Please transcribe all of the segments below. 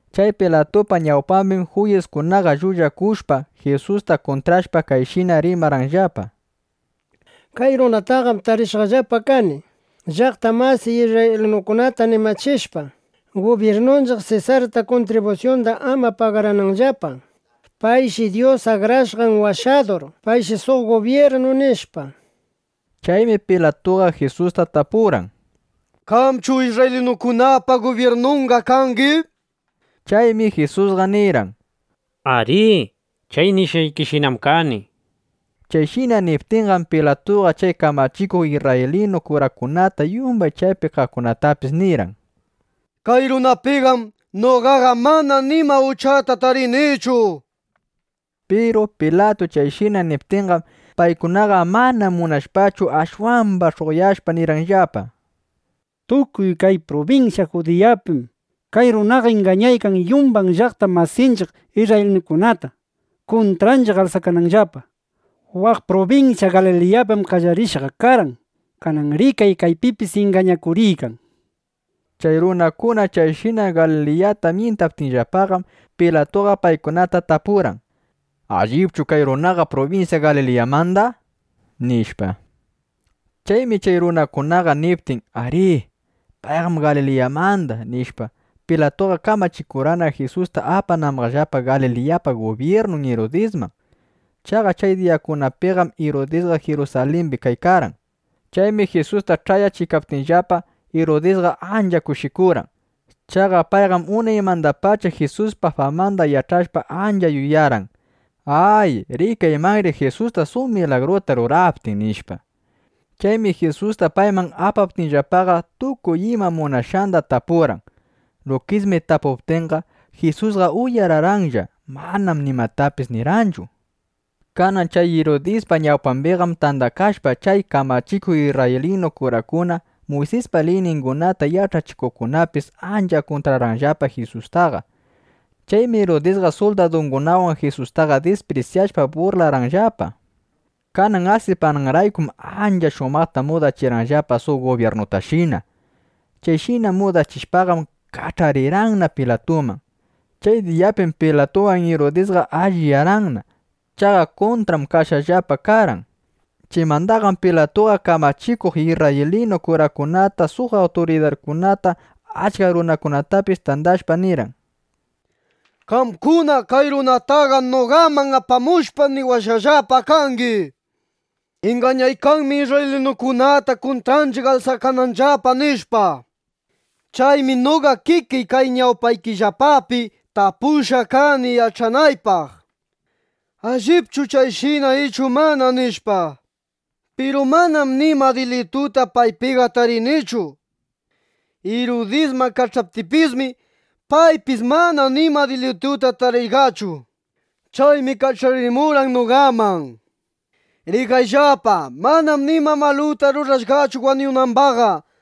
Chay Pilatupa ñawpambim juyiskunaqa llullakushpa, Jisusta kuntrashpa, kayshina rimarqanllapa: —Kay runataqam tarishqallapa kani llaqta masiy isrraylinukunata animachishpa, gubyirnunchiq Sesarta kuntribusyunda ama pagarananllapa. Payshi Dyus Akrashqan Washadur. Payshi suq gubyirnu, nishpa. Chaymi Pilatuqa Jisusta tapurqan: —¿Qamchu isrraylinukunapa gubyirnunqa kangi? nishpa. Chaymi Jisusqa nirqan: —Arí, chay nishqaykishinam kani, nishpa. Chayshina niptinqam, Pilatuqa chay kamachikuq isrraylinu kurakunata, yumbay chaypi kaqkunatapis nirqan: —Kay runapiqam noqaqa mana nima uchata tarinichu, nishpa. Piru Pilatu chayshina niptinqam, paykunaqa mana munashpachu, ashwamba sh'uqyashpa nirqanllapa: —Tukuy kay prubinsya Judiyapim kay runaqa ingañaykan yumbay llaqta masiy isrraylinukunata, kuntranchiq alsakananllapa. Waq prubinsya Galiliyapim qallarishqa karqan. Kananqa rikay, kaypipis ingañakuriykan, nishpa. Chay runakuna chayshina Galiliyata myintaptinllapaqam, Pilatuqa paykunata tapurqan: —¿Allipchu kay runaqa prubinsya Galiliyamanda? nishpa. Chaymi chay runakunaqa niptin: “Arí, payqam Galiliyamanda”, nishpa, Pilatuqa kamachikurqan, Jisusta apanambaqllapa Galiliyapa gubyirnun Irudisman. Chaqa chay diyakunapiqam Irudisqa Jirusalimbi kaykarqan. Chaymi Jisusta, ch'ayachiptinllapa, Irudisqa ancha kushikurqan. Chaqa payqam unaymandapacha Jisuspa famanda yach'ashpa, ancha yuyarqan: Ay, rikaymanri Jisusta suq milagruta ruraptin, nishpa. Chaymi Jisusta payman apaptinllapaqa, tukuy ima munashqanda tapurqan. Lukismi tapuptinqa, Jisusqa uyararqanlla. Manam nimatapis nirqanchu. Kanan chay Irudispa ñawpambiqam tandakashpa, chay kamachikuq isrraylinu kurakuna, Muysispa liyningunata yach'achikuqkunapis ancha kuntrarqanllapa Jisustaqa. Chaymi Irudisqa suldadungunawan Jisustaqa disprisyashpa, burrlarqanllapa. Kanan asipananraykum ancha shumaqta mudachirqanllapa suq gubyirnutashina. Chayshina mudachishpaqam, kach'arirqanna Pilatuman. Chay diyapim Pilatuwan Irudisqa alliyarqanna. Chaqa kuntram kashqallapa karqan. Chaymandaqam Pilatuqa kamachikuq isrraylinu kurakunata, suq awturidarkunata, achka runakunatapis tandashpa, nirqan: —Qamkunam kay runataqa noqaman apamushpa, niwashqallapa kangi: “Ingañaykanmi isrraylinukunata, kuntranchiq alsakananllapa”, nishpa. Chaymi noqa kikiy, kay ñawpaykillapapi tapushqa kani yach'anaypaq: ¿Allipchu chayshina ichu mana? nishpa. Piru manam nima dilituta paypiqa tarinichu. Irudisman kach'aptiypismi, paypis mana nima dilituta tarishqachu. Chaymi kach'arimurqan noqaman. Rikayllapa, manam nima maluta rurashqachu wañunambaqqa.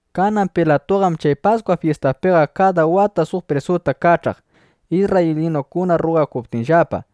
Kanan Pilatuqam chay Paskwa fyistapiqa kada wata suq prisuta kach'aq, isrraylinukuna rrugakuptinllapa.˼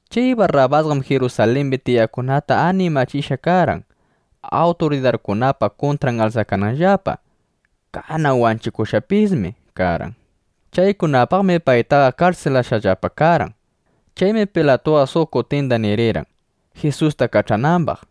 Chay Barrabasqam Jirusalimbi tiyaqkunata animachishqa karqan, awturidarkunapa kuntran alsakananllapa. Kanan wanchikushqapismi karqan. Chaykunapaqmi paytaqa karsilashqallapa karqan. Chaymi Pilatuqa suq kutinda nirirqan, Jisusta kach'anambaq.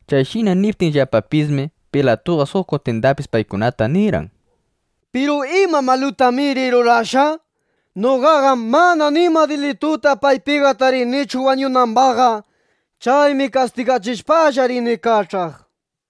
Chayshina niptinllapapismi, Pilatuqa suq kutindapis paykunata nirirqan: —Piru ¿ima malutamiri rurashqa? Noqaqam mana nima dilituta paypiqa tarinichu wañunambaqqa. Chaymi kastigachishpa rini kach'aq, nishpa.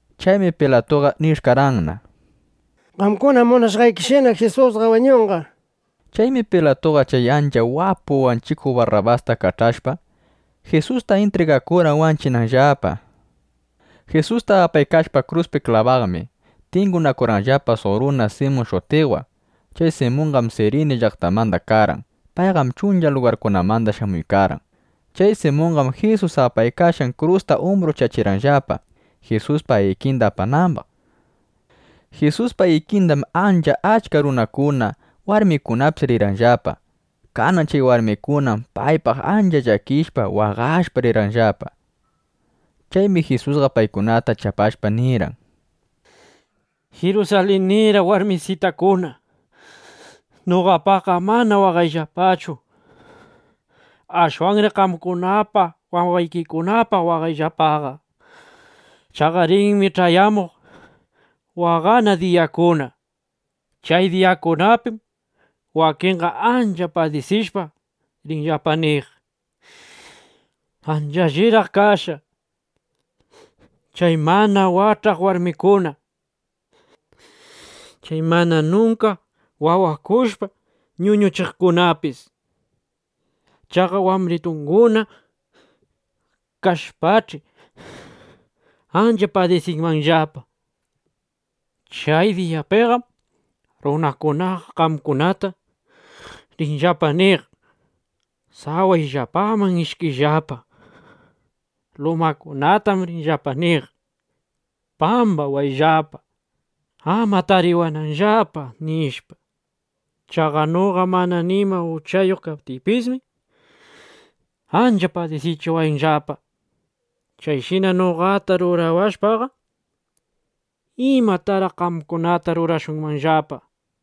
Chaymi Pilatuqa nish'karqanna: —Qamkuna munashqaykishina, Jisusqa wañunqa, nishpa. Chaymi Pilatuqa chay ancha wapu wanchikuq Barrabasta kach'ashpa, Jisusta intrigakurqan wanchinanllapa. Jisusta apaykashpa kruspi klabaqmi, tingunakurqanllapa suq runa Simun shutiqwan. Chay Simunqam Sirini llaqtamanda karqan. Payqam chuncha lugarkunamanda shamuykarqan. Chay Simundaqam Jisus apaykashqan krusta umbruchachirqanllapa, Jisuspa ikinda apanambaq. Jisuspa ikindam ancha achka runakuna, warmikunapis rirqanllapa. Kanan chay warmikunam paypaq ancha llakishpa, waqashpa rirqanllapa. Chaymi Jisusqa paykunata chapashpa, nirqan: —Jirusalinira warmisitakuna, noqapaqqa ama waqayllapachu. Ashwanri qamkunapaq, wawaykikunapaq waqayllapaqa. Chaqa rinmi ch'ayamuq waqana diyakuna. Chay diyakunapim wakinqa ancha padisishpa, rinllapa niq: “Ancha alliraq kashqa chay mana wach'aq warmikuna, chay mana nunka wawakushpa ñuñuchikuqkunapis. (Chaqa wambritunguna kashpach'i ancha padisiykanmanllapa)” nishpa. Chay diyapiqam runakunaqa qaqakunata rinllapa niq: “Sawayllapaman ishkiyllapa”. Lumakunatam rinllapa niq: “Pambawayllapa, ama tariwananllapa”, nishpa. Chaqa noqa mana nima uchayuq kaptiypismi, ancha padisichiwanllapa. Chayshina noqata rurawashpaqa, ¿imataraq qamkunataqa rurashunqallapa? nishpa.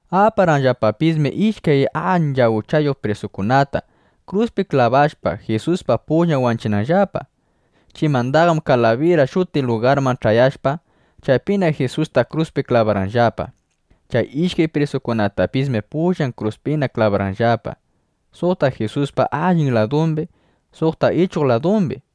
Aparqanllapapismi ishkay ancha uchayuq prisukunata, kruspi klabashpa, Jisuspa pullan wanchinanllapa. Chaymandaqam Kalabira shutiq lugarman ch'ayashpa, chaypina Jisusta kruspi klabarqanllapa. Chay ishkay prisutapismi pullan kruskunapi klabarqanllapa, suqta Jisuspa allin ladumbi, suqta ichuq ladumbi.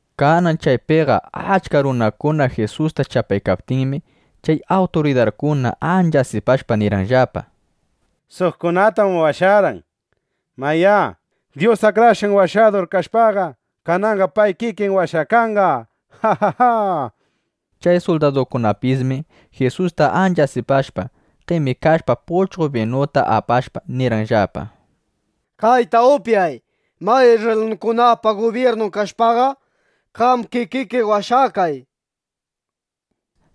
Kanan chaypiqa achka runakuna Jisusta chapaykaptinmi, chay awturidarkuna ancha asipashpa nirqanllapa: —Suqkunatam washarqan. Mayá, Dyus Akrashqan Washadur kashpaqa, kananqa pay kikin washakanqa, nishpa. Chay suldadukunapismi Jisusta ancha asipashpa, qemikashpa, puchqo binuta apashpa, nirqanllapa: —Kayta upyay. Mayá, isrraylinukunapa gubyirnun kashpaqa, qam kikiki washakay, nishpa.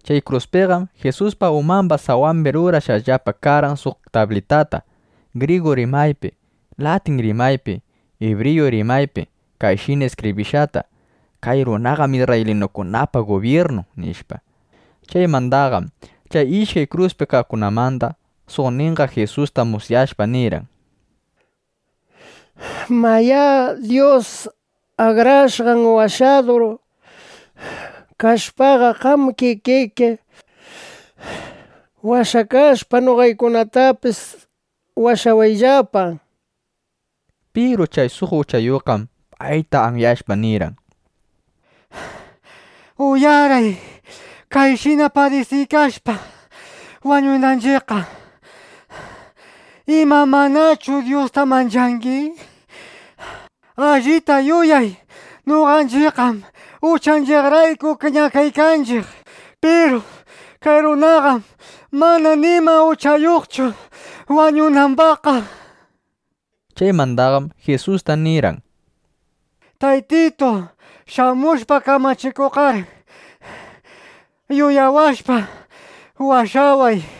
Chay kruspiqam Jisuspa umamba sawambi rurashqallapa karqan suq tablitata, grigu rimaypi, latin rimaypi, ibriyu rimaypi kayshina iskibrishqata: “Kay runaqam isrraylinukunapa gubyirnun”, nishpa. Chaymandaqam chay ishkay kruspi kaqkunamanda suqninqa Jisusta musyashpa, nirqan: —Mayá, Dyus Akrashqan Washadur kashpaqa, qam kikiki washakashpa, noqaykunatapis washawayllapa, nishpa. Piru chay suq uchayuqqam payta anyashpa, nirqan: —¡Uyaray! Kayshina padisiykashpa wañunanchiqqa, ¿ima, manachu Dyusta manchangi? Allita yuyay, noqanchiqqam uchanchiqkunarayku ñakaykanchiq. Piru kay runaqam mana nima uchayuqchu ñakanambaqqa, nishpa. Chaymandaqam Jisusta nirqan: —Shamushpa kamachikuqqar, yuyawashpa, washaway, nishpa.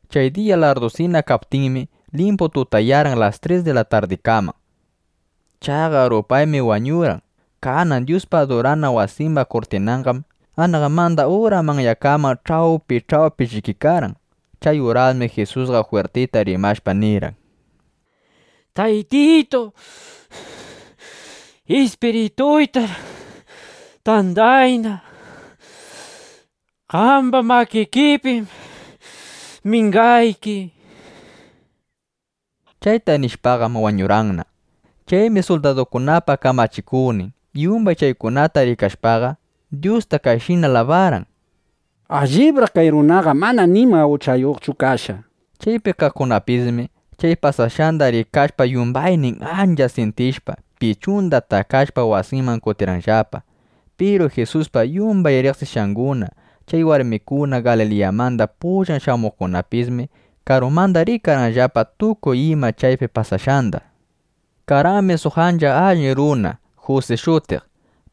Chay diya larrdusina kaptinmi, limpu tutayarqan las tres di la tardikaman. Chaqa rupaymi wañurqan. Kanan Dyuspa adurana wasimba kurtinanqam anaqmanda ura manyakaman ch'awpi ch'awpi llikikarqan. Chay urasmi Jisusqa jwirtita rimashpa nirqan: —Taytitu, ispirituytar tandayna. Qamba makikipim mingayki, nishpa. Chayta nishpaqam wañurqanna. Chaymi suldadukunapa kamachikuqnin yumbay chaykunata rikashpaqa, Dyusta kayshina alabarqan: —Allibraq kay runaqa mana nima uchayuqchu kashqa, nishpa. Chaypi kaqkunapismi chay pasashqanda rikashpa, yumbaynin ancha syintishpa, pichunda takashpa, wasinman kutirqanllapa. Piru Jisuspa yumbay riqsishqanguna, chay warmikuna Galiliyamanda pullan shamuqkunapismi, karumanda rikarqanllapa tukuy ima chaypi pasashqanda. Karqanmi suq ancha allin runa Jusi shutiq.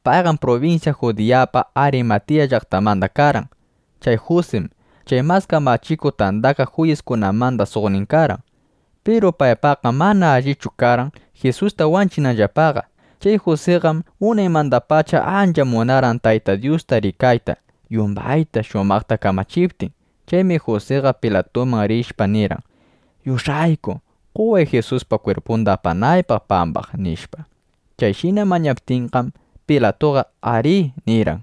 Payqam prubinsya Judiyapa Arimatiya llaqtanmanda karqan. Chay Jusim chay Mas Kamachikuq Tandakaq Juyiskunamanda suqnin karqan. Piru paypaqqam mana allichu karqan Jisusta wanchinanllapaqa. Chay Jusiqam unaymandapacha ancha munarqan Tayta Dyusta rikayta, yumbayta shumaqta kamachiptin. Chaymi Jusiqa Pilatuman rishpa nirqan: —Yush'ayku, qoway Jisuspa kwirpunda, apanaypaq pambaq, nishpa. Chayshina mañaptinqam, Pilatuqa “arí” nirqan.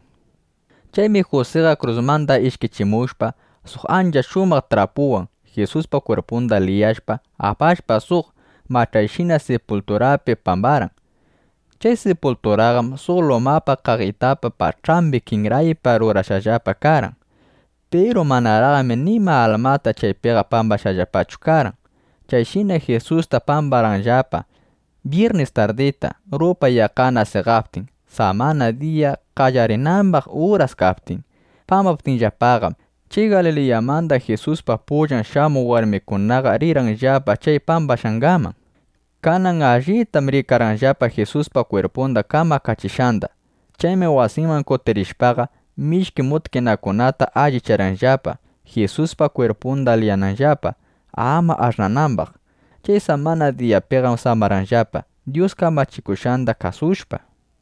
Chaymi Jusiqa krusmanda ishkichimushpa, suq ancha shumaq trapuwan Jisuspa kwirpunda liyashpa, apashpa, suq mach'ayshina sipulturapi pambarqan. Chay sipulturataqam suq luma qaqitapa pach'ambi kinraypa rurashqallapa karqan. Piru manaraqmi nima almata chaypiqa pambashqallapachu karqan. Chayshinam Jisustaqa pambarqanllapa byirnis tardita, rupay yaqqana seqaptin, samana diya qallarinambaq urasna kaptin. Pambaptinllapaqam, chay Galiliyamanda Jisuspa pullan shamuq warmikunaqa rirqanllapa chay pambakashqanman. Kanan allita rikarqanllapa Jisuspa kwirpunda kamakachishqanda. Chaymi wasinman kutirishpaqa, mishki mutkinakunata allicharqanllapa, Jisuspa kwirpunda liyananllapa, ama ash'nanambaq. Chay samana diyapiqam samarqanllapa, Dyus kamachikushqanda kasushpa.